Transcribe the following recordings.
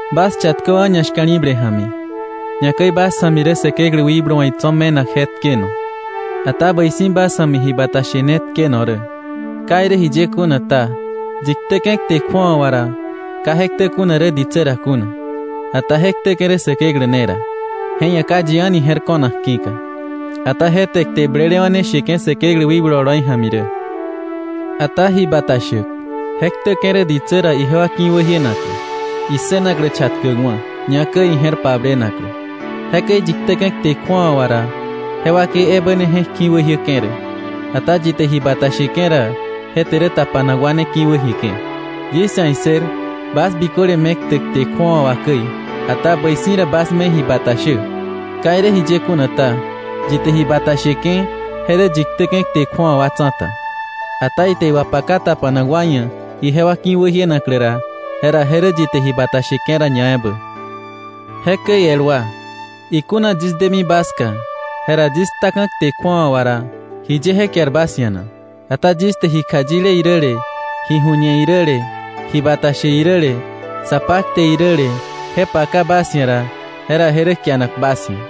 Bas chatköwa̱ ñashka̱li̱ble ja̱mi, ñakäi bas ja̱mi rä Säkeklä wikblu wa̱ itso̱ me̱nak je tkeno, ata bäi si̱ bas ja̱mi ji bata she ne tkeno rä. Ka irä jiye kuna ta, yi ktäke̱ kte kju̱awa wà ra, ka je ktä kuna rä ditsä ra kuna, ata je ktäke̱ rä Säkeklä ne ra, je ia̱ ka yi a̱ni je̱r ko̱nak ki̱ka. Ata je te kte blelewa̱ ne sheke̱ Säkeklä wikblu oloi ja̱mi rä. Ata ji bata shäk, je ktäke̱ rä ditsä ra ijewa ki̱wäjienaklä, issënaklä chatkäkwa̱, ñakäi ije̱r pablenaklä. Jekäi yi ktäke̱ kte kju̱awa wa ra, je wakei ebä ne je̱k ki̱wäjiäke̱ rä. Ata yi te ji bata sheke̱ ra, je te rä tapanak wa ne ki̱wäjieke̱. Yis ia̱ issër bas biköle me ktä kte kju̱awa wà käi, ata bäi si̱ rä bas me ji bata shä. Ka irä jiye kuna ta, yi te ji bata sheke̱, je rä yi ktäke̱ kte kju̱awa wa tsa̱ta. Ata ite iwapaka tapanak wa ia̱ ijewa ki̱wäjienaklä ra, jera je rä yi te ji bata sheke̱ ra ñaebä. Jekäi el wa, ikuna yis demi bas ska, jera yis ktaka̱ kte kju̱awa wa ra, ¿jiye je kiar bas ia̱ na? Ata yis te ji kjayile iräle, ji ju̱ñe iräle, ji bata she iräle, sa pakte iräle, je paka bas ia̱ ra, jera je rä kianak bas ia̱.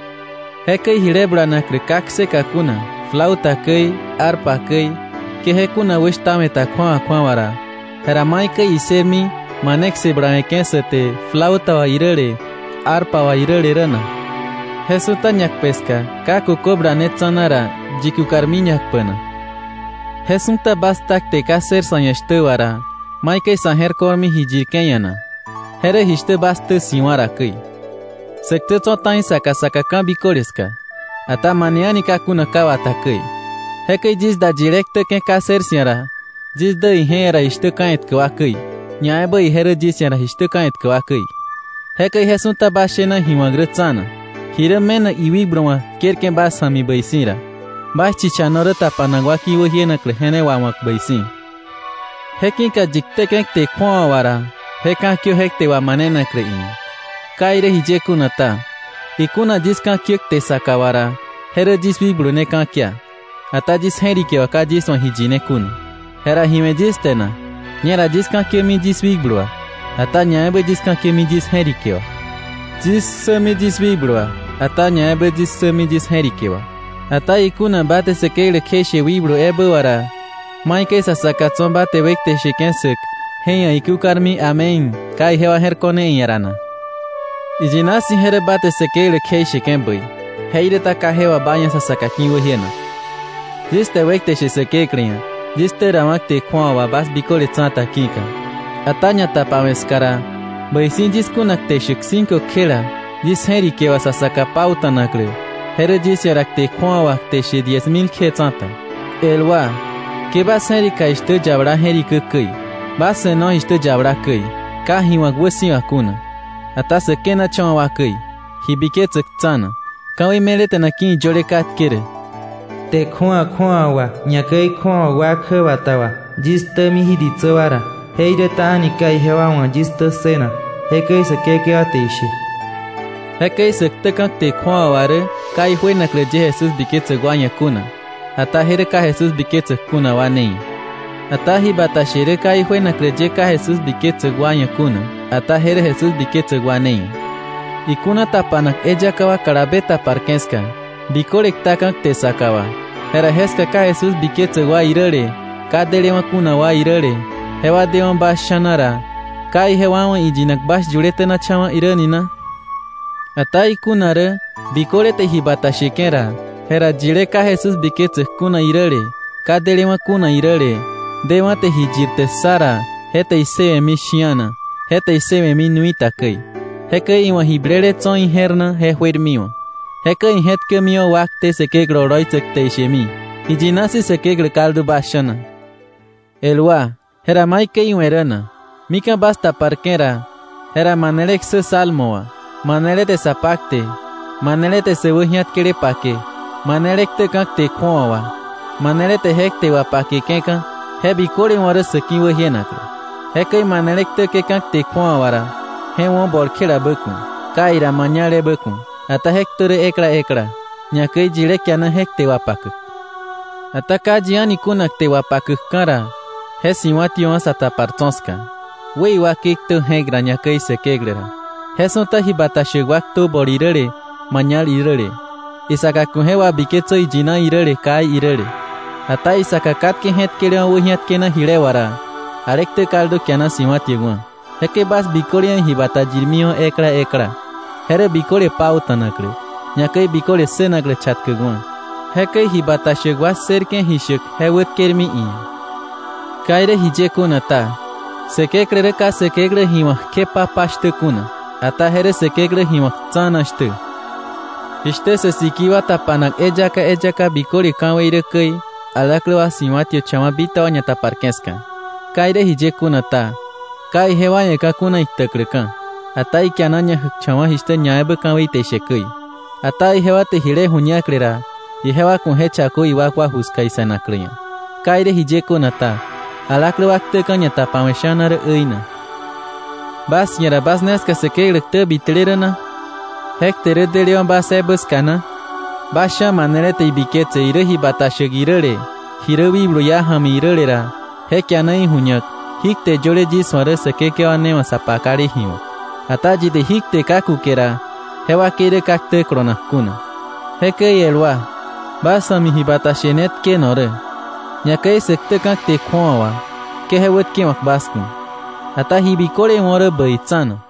Jekäi jile bulanaklä ka kseka kuna, flauta käi, arpa käi, ke je kuna wäshtawe̱ ta kju̱awa kju̱awa ra, jera ¿maikäi issërmi mane kse bulawe̱ke̱ sä te flauta wà iräle arpa wà iräle rä na? Je su̱ta ñakpe ska, ka kökö bulane tsa̱na ra, ¿yi kukarmi ñakpä na? Je su̱ta bas kta kte ka ssër sa̱ ia̱ shtä wà ra, ¿maikäi sa̱ je̱r ko̱rmi ji yirke̱ ia̱ na? Je rä jishtä bas ktä si̱wa̱ ra käi. Sä ktä tso̱ ta̱i saka saka ka̱biköle ska, ata mane a̱ni ka kuna ka wata käi. Jekäi yis da yilé ktäke̱ ka ssër 'sia̱ ra, yis dä ije ia̱ ra jishtä ka̱ etkä wa käi, ñaebä ije rä yis ia̱ ra jishtä ka̱ etkä wa käi. Jekäi je su̱ta bas shena ji wa̱k rä tsa̱na. Ji rä me̱nak iwikblu wa̱ tkerke̱ bas ja̱mi bäi si̱ ra, bas chichano rä tapanak wa ki̱wäjienaklä je ne wawa̱k bäi si̱. Je ki̱ka yi ktäke̱ kte kju̱awa wa ra, je ka̱kiö je kte wamanenaklä iia̱. Ka irä jiye kuna ta, ikuna yis ka̱kiä kte saka wa ra, je rä yis wikblu ne ka̱kia, ata yis je̱rike wà ka yis wa̱ ji yine kuna. Jera, ¿ji we̱ yis te na? Ñera yis ka̱kiämi yis wikblu wà, ata ñaebä yis ka̱kiämi yis je̱rike wà. Yis ksämi yis wikblu wà, ata ñaebä yis ksämi yis je̱rike wà. Ata ikuna ba te Säkeklä kjeishe wikblu ebä wà ra, ¿maikäi sa saka tso̱ ba te wekte sheke̱ ssäk je ia̱ ikúkarmi “Amén”, ka ijewa je̱r ko̱ne iia̱ ra na? Iyina si̱ je rä ba te Säkeklä kjeisheke̱ bäi, jeiräta ka je wà ba ia̱ sa saka ki̱wäjienak. Yis te wekte she Säkeklä ia̱, yis ktä rawa̱ kte kju̱awa wà bas biköle tsa̱ta ki̱ka. Ata ñatapawe̱ ska ra bäi si̱ yis kuna kte shäk cinco kjela yis je̱rike wà sa saka pauta̱naklä, je rä yis ia̱ ra kte kju̱awa wà kte she diez mil kje tsa̱ta. El wa, ke bas je̱rika jishtä yabala je̱rikä käi. Bas se̱no jishtä yabala käi, ka ji wa̱k wäsi̱wa kuna, ata sä kenacha̱wa̱ wa käi, ji biketsäk tsa̱na. Ka̱wei me̱leta̱na ki̱ iyöle katke rä: “Kte kju̱awa kju̱awa wà ñakäi kju̱awa wa kjäbata wà, yis ktämi jí ditsä wa ra, jeiräta a̱ni ka ijewa wa̱ yis ktä ssënak, jekäi Säkekewa te ishe.” Jekäi sä ktäka̱ kte kju̱awa wà rä ka ijuenaklä ye Jesús biketsäk wa ia̱ kuna, ata je rä ka Jesús biketsäk kuna wa ne ia̱. Ata ji bata she rä ka ijuenaklä ye ka Jesús biketsäk wa ia̱ kuna, ata je rä Jesús biketsäk wa ne ia̱. Ikuna tapanak eyaka wa kalabe taparke̱ ska, biköle ktaka̱ kte saka wà, jera jeska ka Jesús biketsäk wa iräle, ka delewa̱ kuna wa iräle, jewa dewa̱ bas sha̱na ra, ¿ka ijewa wa̱ iyinak bas yule tenacha̱wa̱ irä ni na? Ata ikuna rä biköle te ji bata sheke̱ ra, jera yilé ka Jesús biketsäk kuna iräle, ka delewa̱ kuna iräle, dewa̱ te ji yirte ssa ra, je te issëwe̱mi shi̱ana, je te issëwe̱mi nui ta käi. Jekäi iwa̱ ji blele tso̱ ije̱r na je juermiwa̱. Jekäi ije̱tkämiwa̱ wakte Säkeklä oloitsäk te ishemi: “Iyina si̱ Säkeklä kaldu bas sha̱na.” El wa, ¿jera maikäi iwe̱ rä na? Mika̱ bas taparke̱ ra, jera manele ksä salmo wà, manele te sa pakte, manele te sä wäji̱atkele pake, manele ktäka̱ kte kju̱awa wà, manele te je kte wapakeka̱. Je biköle wo̱ rä sa̱ ki̱wäjienaklä. Jekäi manele ktäke̱ka̱ kte kju̱awa wà ra, je wo̱ bol kjelabä ku̱, kai ra mañal ebä ku̱, ata je ktö rä ekla ekla, ñakäi yilé kiana je kte wapakäk. Ata ka yi a̱ni kuna kte wapakäkka̱ ra, je si̱wa̱tiöwa̱ sa tapar tso̱ ska; wë iwakei ktö je̱k ra ñakäi Säkeklä ra. Je su̱ta ji bata shäk wa ktö bol iräle mañal iräle. Isaka ku̱ je wabitketsö iyina iräle kai iräle. Ata isaka katke je̱tkelewa̱ wäji̱atkena jile wà ra, ale ktä kaldu kiana si̱wa̱tiäkwa̱. Jekäi bas biköle ia̱ ji bata yirmiwa̱ ekla ekla, je rä biköle pauta̱naklä, ñakäi biköle ssënaklä chatkäkwa̱. Jekäi ji bata shäk wa ssërke̱ ji shäk je wätkermi iia̱. Ka irä jiye kuna ta, Säkeklä rä ka Säkeklä ji wa̱k kje pa pa shtä kuna, ata je rä Säkeklä ji wa̱k tsa̱na shtä. Jishtä sä sikii wa tapanak eyaka eyaka biköle ka̱wei rä käi, alaklä wa si̱wa̱tiöcha̱wa̱ bitaba ñataparke̱ ska. Ka irä jiye kuna ta, ka ijewa ia̱ ka̱ kuna iktäkläka̱, ata ikiana ñajäkcha̱wa̱ jishtä ñaebä ka̱wei te ishe käi. Ata ijewa te jile ju̱ñakle ra, ijewa ku̱ je chakö iwakwa ju ska ise̱naklä ia̱. Ka irä jiye kuna ta, alaklä wa ktäka̱ ñatapawe̱ sha̱na rä äina. ¿Bas ia̱ ra bas ne ska Säkeklä ktä bitele rä na? ¿Je kte rä delewa̱ bas ebä ska na? Bas sha̱ manele te ibiketse irä ji bata shäk iräle, ji rä wikblu iá ja̱mi iräle ra, je kiana iju̱ñak jí kte yöle yis wa̱ rä Säkekewa ne wa̱ sa pakale ji wa̱k. Ata yi te jí kte ka kuke ra, je wakei rä ka ktä kolonak kuna. Jekäi el wa, bas ja̱mi ji bata she ne tkeno rä, ñakäi sä ktäka̱ kte kju̱awa wà, ke je wätkewa̱k bas ku̱. Ata ji biköle wo̱ rä bäi tsa̱na.